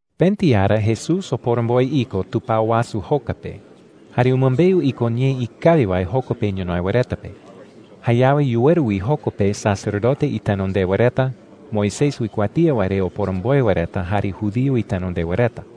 Pëti ara Jesús oporomboe iko tupao wasu joka pe, jare umɨmbeu iko ñee ikawi wae joko pe ñonoï wae reta pe. Jayawe yuweru wi joko pe sacerdote itenondewa reta, Moisés uikuatía wae re oporomboe wae reta, jare judío itenondewa reta.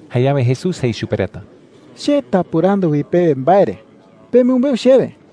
Jayawe Jesús jei chupe reta: “Che tapɨrandu wi pewe mbae re. Pemɨmbeu chewe: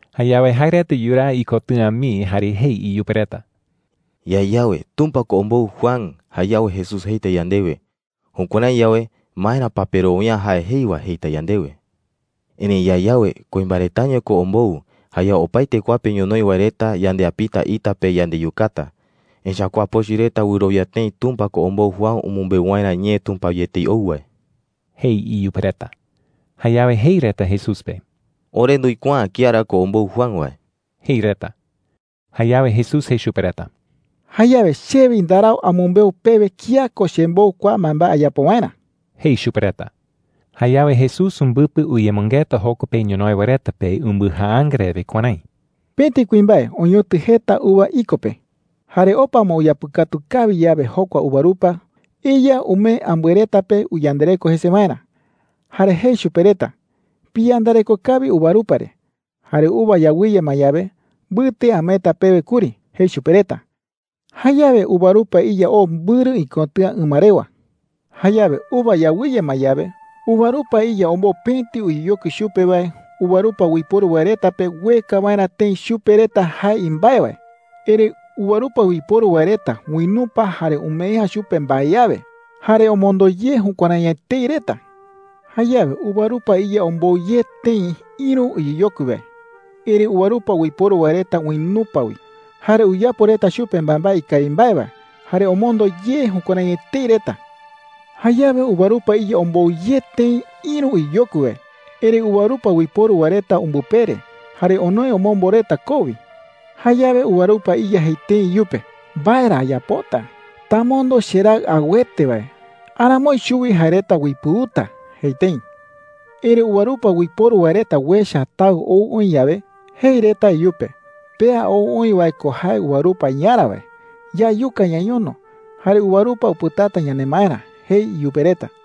Jayawe jae reta yuraa ikotɨ̈a mii jare jei iyupe reta: “Yae yawe, ‘Tumpa ko ombou Juan,’ jayawe Jesús jeita yandewe, ‘Jukuärái yawe, ¿maera pa perowia’ä jae jei wae?’ jeita yandewe. Erëi yae yawe, ‘Kuimbae retaño ko ombou,’ jayawe opaete kua pe ñonoï wae reta yandeapita ita pe yandeyukata. Echa’ä kua pochɨ reta wɨrowia tëi Tumpa ko ombou Juan umɨmbeu waerä ñee Tumpa wi etei ou wae,” jei iyupe reta. Jayawe jei reta Jesús pe: “Ore nduikuaa’ä kía ra ko ombou Juan wae,” jei reta. Jayawe Jesús jei chupe reta: “Jayawe che wi ndarau amɨmbeu pewe kía ko chembou kua mbaembae ayapo waerä,” jei chupe reta. Jayawe Jesús umbɨpɨ uyemɨngeta joko pe ñonoï wae reta pe umbɨjaanga rewe kuärái: “Pëti kuimbae oñotɨ jeta uva iko pe,” jei. “Jare opa ma uyapɨkatu kawi yawe jokua uvarupa, iya umee ambɨe reta pe uyandareko jese waerä. Jare jei chupe reta: ‘Piyandareko kawi uvarupa re. Jare uva yawɨye ma yawe, mbɨte ameeta pewe kuri,’ jei chupe reta. Jayawe uvarupa iya oo mbɨrɨ ikotɨ̈a ɨma rewa,” jei Jesús. “Jayawe uva yawɨye ma yawe, uvarupa iya ombou pëti uyeyokui chupe wae uvarupa uiporu wae reta pe ueka waerä tëi chupe reta jae imbae wae. Erëi uvarupa uiporu wae reta uinupa jare umee’ä chupe mbae awe. Jare omondo ye jukuärái etei reta,” jei. “Jayawe uvarupa iya ombou ye tëi ïru uyeyokui wae. Erëi uvarupa uiporu wae reta uinupa wi, jare uyapo reta chupe mbaembae ikawi mbae wae, jare omondo ye jukuärái etei reta,” jei. “Jayawe uvarupa iya ombou ye tëi ïru uyeyokui wae. Erëi uvarupa uiporu wae reta umbɨpere, jare onoe omombo reta koo wi,” jei. “Jayawe uvarupa iya jei tëi iyupe: “¿Mbae ra ayapota? Tamondo cheraɨ auete wae. Aramoi chuwi jae reta uipɨuta,’ jei tëi. “Erëi uvarupa uiporu wae reta uecha taɨ ou oï yawe, jei reta iyupe: ‘Pea ou oï wae ko jae uvarupa iyarä wae. Yayuka ñañono, jare uvarupa upɨtata yanemaerä,’ jei iyupe reta.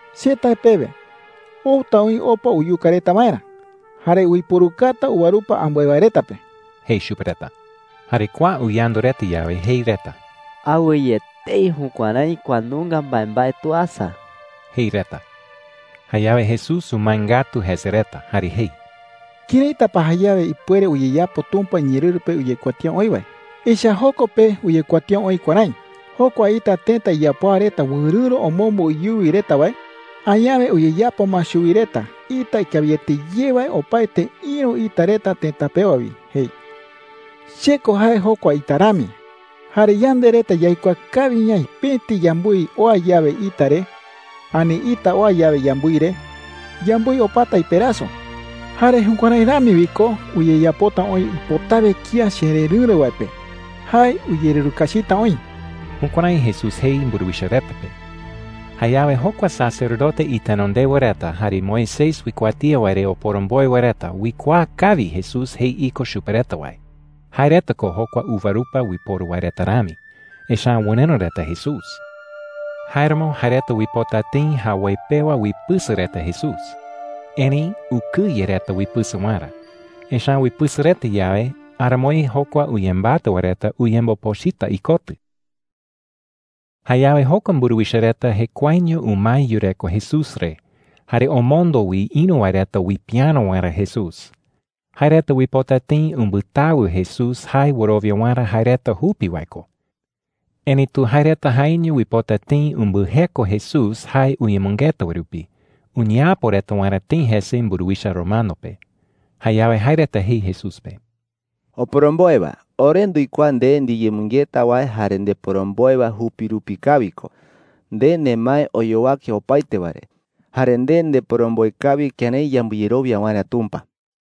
“Che tae pewe, outa oï opa uyuka reta waerä, jare uiporukata uvarupa ambɨe wae reta pe,” jei chupe reta. Jare kua uyandu reta yawe, jei reta: “¡Awɨye etei jukuärái kua nunga mbaembae tuasa!” jei reta. Jayawe Jesús umae ngatu jese reta jare jei: “¿Këraita pa jayawe ipuere uyeyapo Tumpa iñeerɨru pe uyekuatía oï wae? Echa’ä joko pe uyekuatía oï kuärái: ‘Jokua ita tëta iyapoa reta wɨrɨ̈ro omombo iyuwi reta wae, añawe uyeyapo ma chuwi reta ita ikawiete ye wae opaete ïru ita reta tëta pewa wi,’ jei. Che ko jae jokua ita rami. Jare yande reta yaikuaa kawi ñaï pëti yambɨi oa yawe ita re, ani ita oa yawe yambɨi re, yambɨi opata iperaso,” jei. “Jare jukuärái rami wi ko uyeyapota oï ipotawe kía chererɨ̈ro wae pe. Jae uyererukachita oï.” Jukuärái Jesús jei mburuwicha reta pe. Jayawe jokua sacerdote itenondewa reta jare Moisés uikuatía wae re oporomboe wae reta uikuaa kawi Jesús jei iko chupe reta wae – jae reta ko jokua uvarupa uiporu wae reta rami, echa’ä wɨrɨ̈ro reta Jesús. Jáeramo jae reta uipota tëi jawoi pewa uipɨsɨka reta Jesús. Erëi ukɨye reta uipɨsɨka waerä. Echa’ä uipɨsɨka reta yawe, aramoi jokua uyembatɨ wae reta uyembopochɨta ikotɨ. Jayawe jokua mburuwicha reta jekuaeño umae yureko Jesús re, jare omondo wi ïru wae reta uipiäro waerä Jesús. Jae reta uipota tëi umbɨtawɨ Jesús jae wɨrowia waerä jae reta jupi wae ko. Erëitu jae reta jaeño uipota tëi umbɨjeko Jesús jae uyemɨngeta wae rupi, uñeapo reta waerä tëi jese mburuwicha romano pe. Jayawe jae reta jei Jesús pe: “Oporomboe wae, ore nduikuaa nde ndiyemɨngeta wae jare ndeporomboe wae jupi rupi kawi ko. Nde nemae oyowake opaete wae re. Jare nde ndeporomboe kawi kërái yambɨyerowia waerä Tumpa,” jei reta.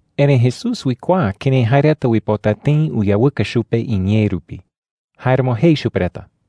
Erëi Jesús uikuaa kërái jae reta uipota tëi uyawɨka chupe iñee rupi. Jáeramo jei chupe reta: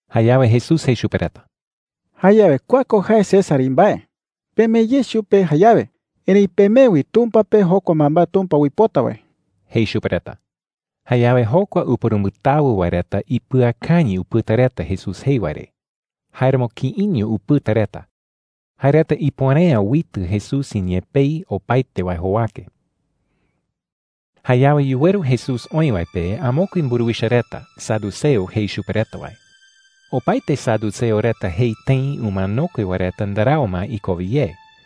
Jayawe Jesús jei chupe reta: “Jayawe kua ko jae César imbae. Pemee ye chupe jayawe. Erëi pemee wi Tumpa pe jokua mbaembae Tumpa uipota wae,” jei chupe reta. Jayawe jokua upurumbɨtawɨ wae reta ipɨakañɨ upɨta reta Jesús jei wae re. Jáeramo kïiño upɨta reta. Jae reta ipuere’ä uitɨ Jesús iñee pei opaete wae jowake. Jayawe yuweru Jesús oï wae pe amokue mburuwicha reta, saduceo jei chupe reta wae. Opaete saduceo reta jei tëi umanokue wae reta ndarau ma ikowe ye.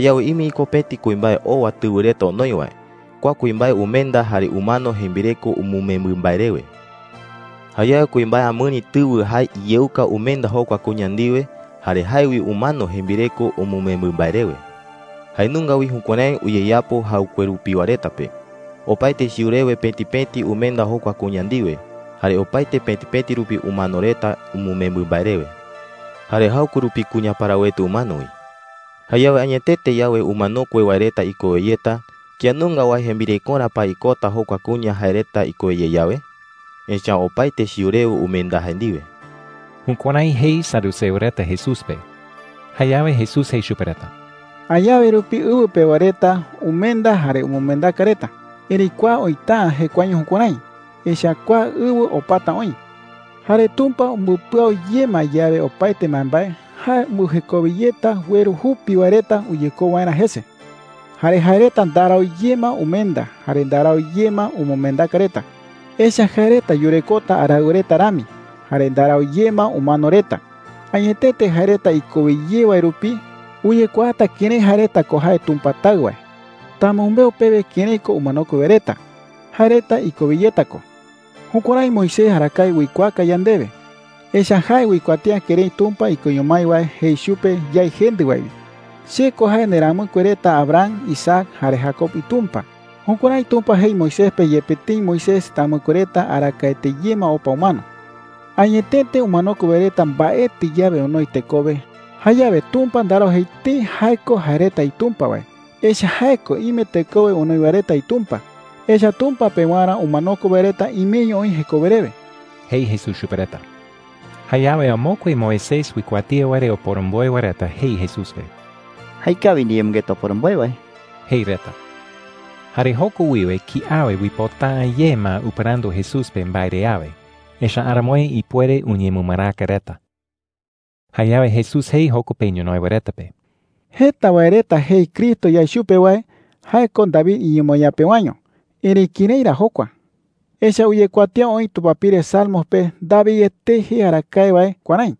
“Jayawe ime iko pëti kuimbae owa tɨwɨ reta onoi wae. Kua kuimbae umenda, jare umano jembireko umɨmembɨ mbae rewe,” jei reta. “Jayawe kuimbae amɨri tɨwɨ jae iyeuka umenda jokua kuña ndiwe. Jare jae wi umano jembireko umɨmembɨ mbae rewe,” jei reta. “Jae nunga wi jukuärái uyeyapo jaɨkue rupiwa reta pe. Opaete chiu rewe pëti pëti umenda jokua kuña ndiwe, jare opaete pëti pëti rupi umano reta umɨmembɨ mbae rewe. Jare jaɨkue rupi kuña parawete umano wi,” jei reta. “Jayawe añetete yawe umanokue wae reta ikowe yeta, ¿kía nunga wae jembirekorä pa ikota jokua kuña jae reta ikowe ye yawe? Echa’ä opaete chiu rewe umenda jae ndiwe.” Jukuärái jei saduceo reta Jesús pe. Jayawe Jesús jei chupe reta: “Añawe rupi ɨwɨ pewa reta umenda jare umɨmendaka reta. Erëi kua oïta’ä jekuaeño jukuärái, echa’ä kua ɨwɨ opata oï,” jei. “Jare Tumpa umbɨpɨau ye ma yawe opaete mbaembae, jae umbɨjekowe yeta ueru jupi wae reta uyekou waerä jese,” jei. “Jare jae reta ndarau ye ma umenda jare ndarau ye ma umɨmendaka reta. Echa’ä jae reta yurekota araɨwa reta rami, jare ndarau ye ma umano reta. Añetete jae reta ikowe ye wae rupi uyekuaata kërái jae reta ko jae Tumpa Taɨ wae,” jei chupe reta. “Tamɨmbeu pewe kërái ko umanokue wae reta. Jae reta ikowe yeta ko,” jei. “Jukuärái Moisés arakae uikuaaka yandewe. Echa’ä jae uikuatía kërái Tumpa ikoño mái wae jei chupe yái jendɨ wae wi: ‘Che ko jae nderamɨkue reta Abraham, Isaac, jare Jacob iTumpa.’ Jukuärái Tumpa jei Moisés pe yepe tëi Moisés tamɨkue reta arakaete ye ma opa umano,” jei. “Añetete umanokue wae reta mbaetɨ yawe onoi tekowe, jayawe Tumpa ndarau jei tëi jae ko jae reta iTumpa wae, echa’ä jae ko ime tekowe onoi wae reta iTumpa. Echa’ä Tumpa pewarä, umanokue wae reta imeño oï jekowe rewe,” jei Jesús chupe reta. Jayawe amokue Moisés uikuatía wae re oporomboe wae reta jei Jesús pe: “Jaekawi ndiyemɨngeta, oporomboe wae,” jei reta. Jare joko wiwe kiawe uipota’ä ye ma upɨrandu Jesús pe mbae re awe, echa’ä aramoi ipuere uñemɨmaraka reta. Jayawe Jesús jei joko pe ñonoï wae reta pe: “Jeta wae reta jei Cristo yae chupe wae jae ko David iñemoñaa pewaño. Erëi, ¿kërái ra jokua? Echa’ä uyekuatía oï tupapire Salmos pe David etei jei arakae wae kuärái: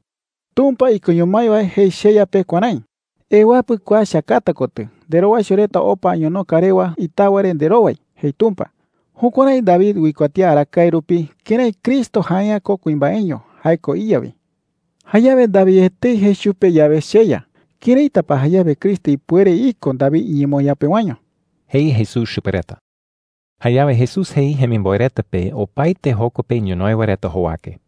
‘Tumpa ikoño mái wae jei cheYa pe kuärái: ‘Ewapɨ kua cheakata kotɨ, nderowaicho reta opa añonoka rewa itawa re nderowai,’ jei Tumpa.’ Jukuärái David uikuatía arakaete rupi kërái Cristo jae’ä ko kuimbaeño. Jae ko iYa wi. Jayawe David etei jei chupe yawe, ‘CheYa,’ ¿këraita pa jayawe Cristo ipuere iko David iñemoñaa pewaño?” jei Jesús chupe reta. Jayawe Jesús jei jemimboe reta pe opaete joko pe ñonoï wae reta jowake: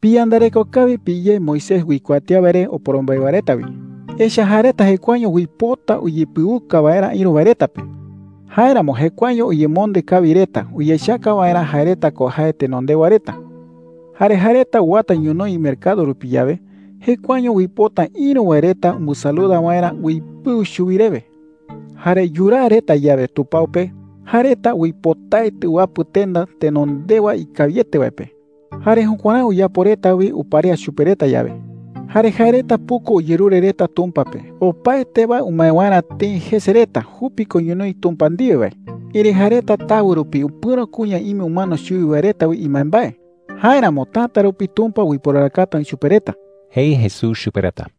“Piyandareko kawi piyé Moisés uikuatía wae re oporomboe wae reta wi,” jei chupe reta. “Echa’ä jae reta jekuaeño uipota uyepɨuka waerä ïru wae reta pe. Jáeramo jekuaeño uyemonde kawi reta uyechaka waerä jae reta ko jae tenondewa reta,” jei. “Jare jae reta uwata ñonoï mercado rupi yawe, jekuaeño uipota ïru wae reta umbɨsaluda waerä uipɨu chuwi rewe,” jei. “Jare yuraa reta yawe tupao pe, jae reta uipotaete uwapɨ tenda tenondewa ikawiete wae pe. Jare jukuärái uyapo reta wi uparea chupe reta yawe,” jei. “Jare jae reta puku uyerure reta Tumpa pe opaete wae umae waerä tëi jese reta jupi ko ñonoï Tumpa ndiwe wae. Erëi jae reta tawɨ rupi upɨ̈ro kuña ime umano chuwi wae reta wi imbaembae. Jáeramo täta rupi Tumpa uiporarakata oï chupe reta,” jei Jesús chupe reta.